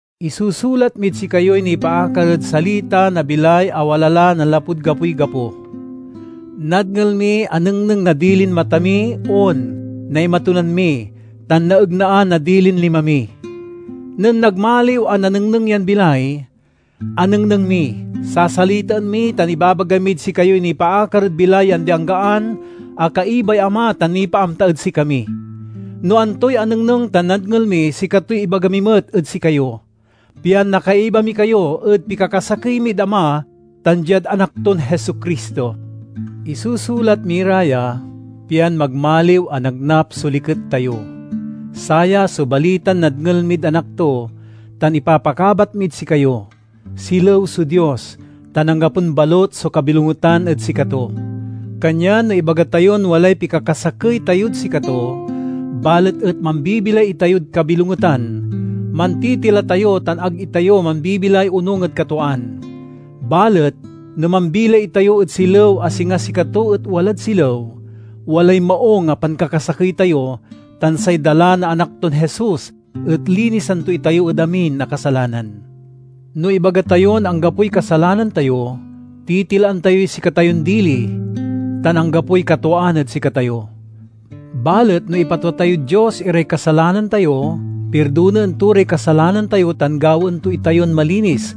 Isusulat mid sikayoy nipaakar ed Salita na bilay a wala la nanlapud gapoy gapo. Nadngel mi, anengneng na dilin mata mi, on, naimatunan mi, tan naegnaan na dilin lima mi. Nen nagmaliw a nanengneng yan bilay, anengneng mi. Sasalitaen mi tan ibabaga mid sikayoy nipaakar ed bilay ya andi-anggaan a kaibay Ama tan nipaamta ed sikami. No antoy anengneng tan nadngel mi sikatoy ibaga mi met ed sikayo, pian nakaiba mi kayo ed pikakasakey mid Ama tan diad Anak ton Jesu-Cristo. Isusulat mi ra ya, pian magmaliw a nagnap so liket tayo. Saya so balitan nadngel mid Anak to, tan ipapakabat mid sikayo: Silew so Dios tan anggapon balut so kabilongetan ed sikato. Kanyan no ibaga tayon walay pikakasakey tayod sikato, balet et mambibilay itayod kabilongetan, mantitila tayo tan ag itayo mambibilay onung ed katwaan. Balet no mambilay itayo ed silew a singa sikato et walad silew, walay maung a pankakasakey tayo tan say dala na Anak ton Jesus et linisan to itayo ed amin a kasalanan. No ibaga tayon anggapoy kasalanan tayo, titilaan tayoy sikatayon dili tan anggapoy katwaan ed sikatayo. Balet no ipatwa tayod Dios iray kasalanan tayo, pirdonaen to ray kasalanan tayo tan gawaen to itayon malinis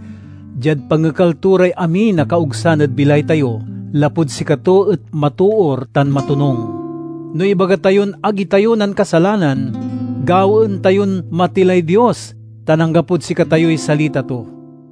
diad pangekal to ray amin a kaogsan ed bilay tayo, lapud sikato et matoor tan matonung. No ibaga tayon ag itayo nankasalanan, gawaen tayon matilay Dios tan anggapod sikatayoy salita to.